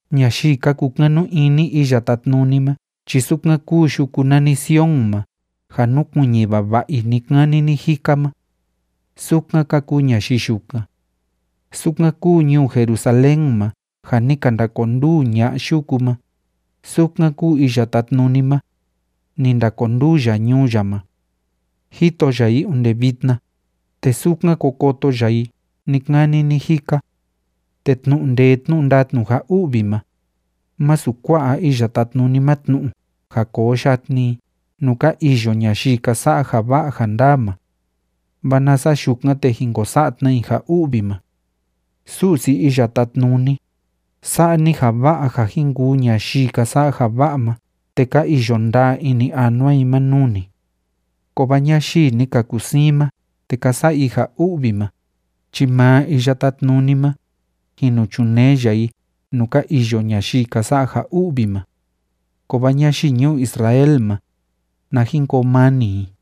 Ñayii ka kukanu ini Iya Tátnuni ma chi sukan kúu yuku nani Sion ma ja núkuiñi vava'a i ni‑kani ni‑jika ma, sukan ka kuu ñayii yukan. Sukan kúu ñuu Jerusalén ma ja ni ka ndakonduu ña'a yuku ma, sukan kúu Iya Tátnuni ma, ni ndakonduu ya ñuu ya ma. Jito ya i onde vitna, te sukan ko koto ya i ni‑kani ni‑jika. Te tnu'u ndee tnu'u ndatnu ja u'vi ma, másu kua'a Iya Tátnuni ma tnu'u ja koo yatni i nuu ka iyo ñayii ka sa'a ja va'a ja ndaa ma. Vaa nasa yukan, te jin ko sa'a tna i ja u'vi ma. Su'si Iya Tátnuni, sa'a ni ja va'a ja jin kuu ñayii ka sa'a ja va'a ma te ka iyo ndaa ini anua i ma nuu ni. Kovaa ñayii ni ka kusiin ma te ka sa'a i ja u'vi ma, chi maa Iya Tátnuni ma, jin nu chunee ya i nuu ka iyo ñayii ka sa'a ja u'vi ma. Kovaa ñayii ñuu Israel ma, na jin koo mani i.